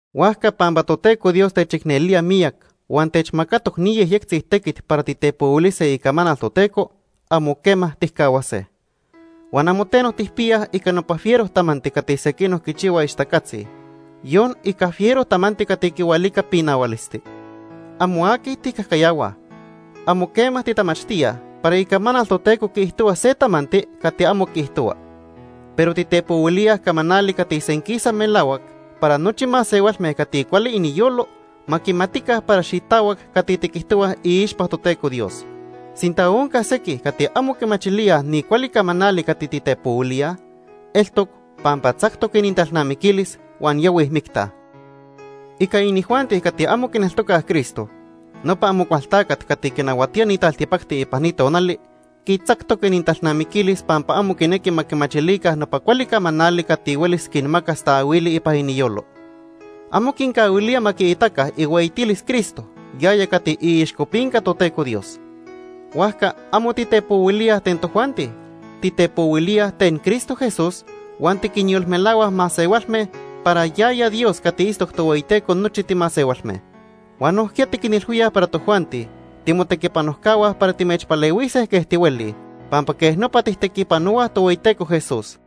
Huajca pampa Toteco Dios techicnelía miyac huan techmacatoc ni yejyectzi tequit para titepohuilise icamanal Toteco, amo quema tijcahuase. Huan amo teno tijpiyaj ica nopa fiero tamanti cati sequinoc quichihuaj ixtacatzi, yon ica fiero tamanti cati quihualica pinahualisti. Amo aqui tijcajcayahuaj. Amo quema titamachtíaj para Icamanal Toteco quiijtohua se tamanti cati amo quiijtohua. Pero titepohuilíaj camanali cati senquisa melahuac para nochi masehualme cati cuali iniyolo ma quimatica para xitahuac cati tiquijtohuaj iixpa Toteco Dios. Sinta onca sequij cati amo quimachilíaj ni cuali camanali cati titepohuilíaj, eltoc pampa tzactoc inintalnamiquilis huan yahuij micta. Ica inijuanti cati amo quineltocaj Cristo, nopa Amocualtacat cati quinahuatía ni taltipacti ipan ni tonali, quitzactoc inintalnamiquilis pampa amo quinequi ma quimachilica nopa cuali camanali cati huelis quinmacas taahuili ipan iniyolo. Amo quincahuilía ma quiitaca ihueyitilis Cristo yaya cati iixcopinca Toteco Dios. Huajca amo titepohuilíaj ten tojuanti, titepohuilíaj ten Cristo Jesús huan tiquinyolmelahuaj masehualme para yaya Dios cati itztoc Tohueyiteco nochi timasehualme. Huan nojquiya tiquinilhuíaj para tojuanti timotequipanojcahua para timechpalehuise quej tihuelij, pampa quej nopa tijtequipanohuaj Tohueyiteco Jesús.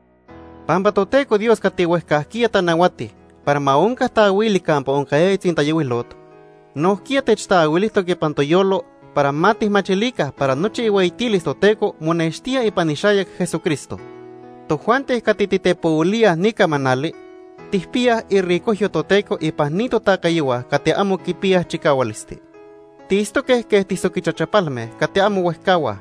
Pampa Toteco Dios cati huejcajquiya tanahuati para ma onca taahuili campa oncayaya tzintayohuilot, nojquiya techtaahuilijtoc ipan toyolo para ma tijmachilica para nochi ihueyitilis Toteco monextía ipan ixayac Jesucristo. Tojuanti cati titepohuilíaj ni camanali tijpiyaj iricojyo Toteco ipan ni totacayohua cati amo quipiyaj chicahualisti. Tiitztoque quej tisoquichachapalme cati amo huejcahuaj.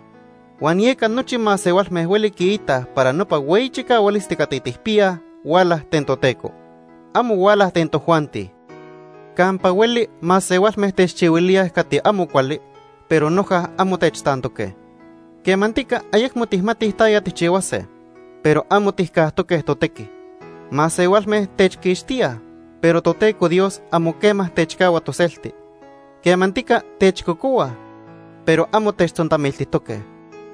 Huan yeca nochi masehualme hueli quiitaj para nopa hueyi chicahualisti cati tijpiyaj, huala ten Toteco. Amo huala ten tojuanti. Campa hueli masehualme techchihuilíaj cati amo cuali, pero noja amo techtantoque. Quemantica ayecmo tijmatij taya tijchihuase, pero amo tijcajtoque totequi. Masehualme techquixtíaj, pero Toteco Dios amo quema techcahua toselti. Quemantica techcocohuaj, pero amo techtzontamiltijtoque.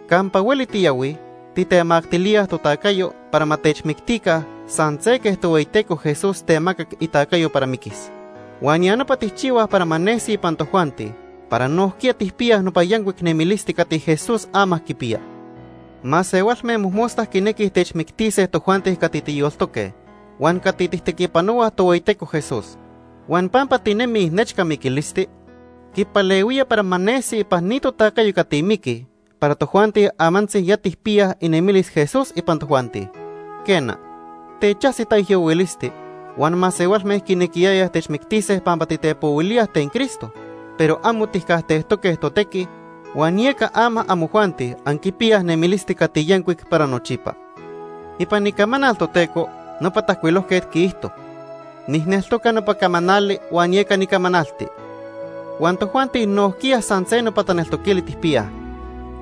Campa hueli tiyahuij tijtemactilíaj totacayo para ma techmictica san se quej Tohueyiteco Jesús temacac itacayo para miquis. Huan ya nopa tijchihuaj para ma nesi ipan tojuanti para nojquiya tijpiyaj nopa yancuic nemilisti cati Jesús ama quipiya. Masehualme mojmosta quinequij techmictise tojuanti cati tiyoltoque huan cati tijtequipanohuaj Tohueyiteco Jesús. Huan pampa tinemij nechca miquilisti, quipalehuía para ma nesi ipan ni totacayo cati miquij para tojuanti amantzi ya tijpiyaj inemilis Jesús ipan tojuanti. Quena, techajsi taijyohuilisti huan masehualme quinequiyayaj techmictise pampa titepohuilíaj ten Cristo, pero amo tijcajtejtoque totequi, huan yeca ama amojuanti anquipiyaj nemilisti cati yancuic para nochipa. Ipan Icamanal Toteco nopa tajcuilojquet quiijto: “Nijneltoca nopa camanali huan yeca nicamanalti.” Huan tojuanti nojquiya san se nopa taneltoquili tijpiyaj.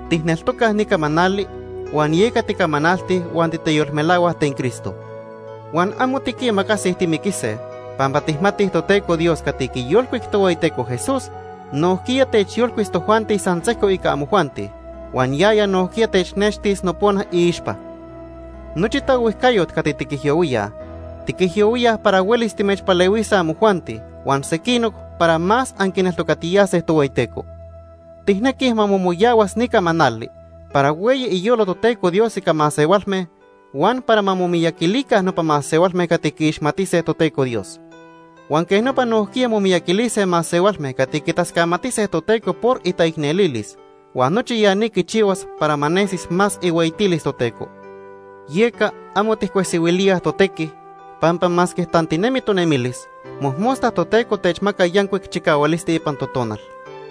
Tijneltocaj ni camanali huan yeca ticamanaltij huan titeyolmelahuaj ten Cristo. Huan amo tiquimacasij timiquise pampa tijmatij Toteco Dios cati quiyolcuic Tohueyiteco Jesús, nojquiya techyolcuis tojuanti san sejco ica amojuanti, huan yaya nojquiya technextis nopona iixpa. Nochi taohuijcayot cati tiquijyohuíaj, tiquijyohuíaj para huelis timechpalehuise amojuanti huan sequinoc para más anquineltocatiyase Tohueyiteco. Tijnequij ma momoyahuas ni camanali para hueyi iyolo Toteco Dios ica masehualme huan para ma momiyaquilica nopa masehualme cati quiixmatise Toteco Dios. Huan quej nopa nojquiya momiyaquilise masehualme cati quitascamatise Toteco por itaicnelilis, huan nochi ya ni quichihuas para ma nesis más ihueyitilis Toteco. Yeca amo tijcuesihuilíaj totequi, pampa masque tantinemi tonemilis, mojmosta Toteco techmaca yancuic chicahualisti ipan totonal.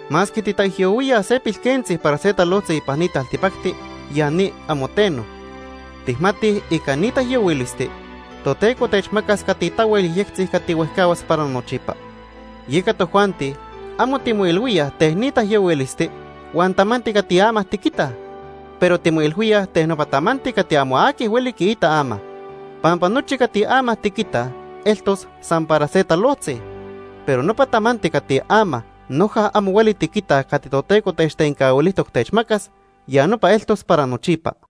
Masque titaijyohuíaj se pilquentzi para se talojtzi ipan ni taltipacti, ya ni amo teno. Tijmatij ica ni taijyohuilisti, Toteco techmacas cati tahuel yejyectzi cati huejcahuas para nochipa. Yeca tojuanti amo timoilhuíaj ten ni taijyohuilisti huan tamanti cati ama tiquitaj, pero timoilhuíaj ten nopa tamanti cati amo aqui hueli quiita ama. Pampa nochi cati ama tiquitaj eltos san para se talojtzi, pero nopa tamanti cati ama noja amo hueli tiquitaj cati Toteco techtencahuilijtoc techmacas, ya nopa eltos para nochipa.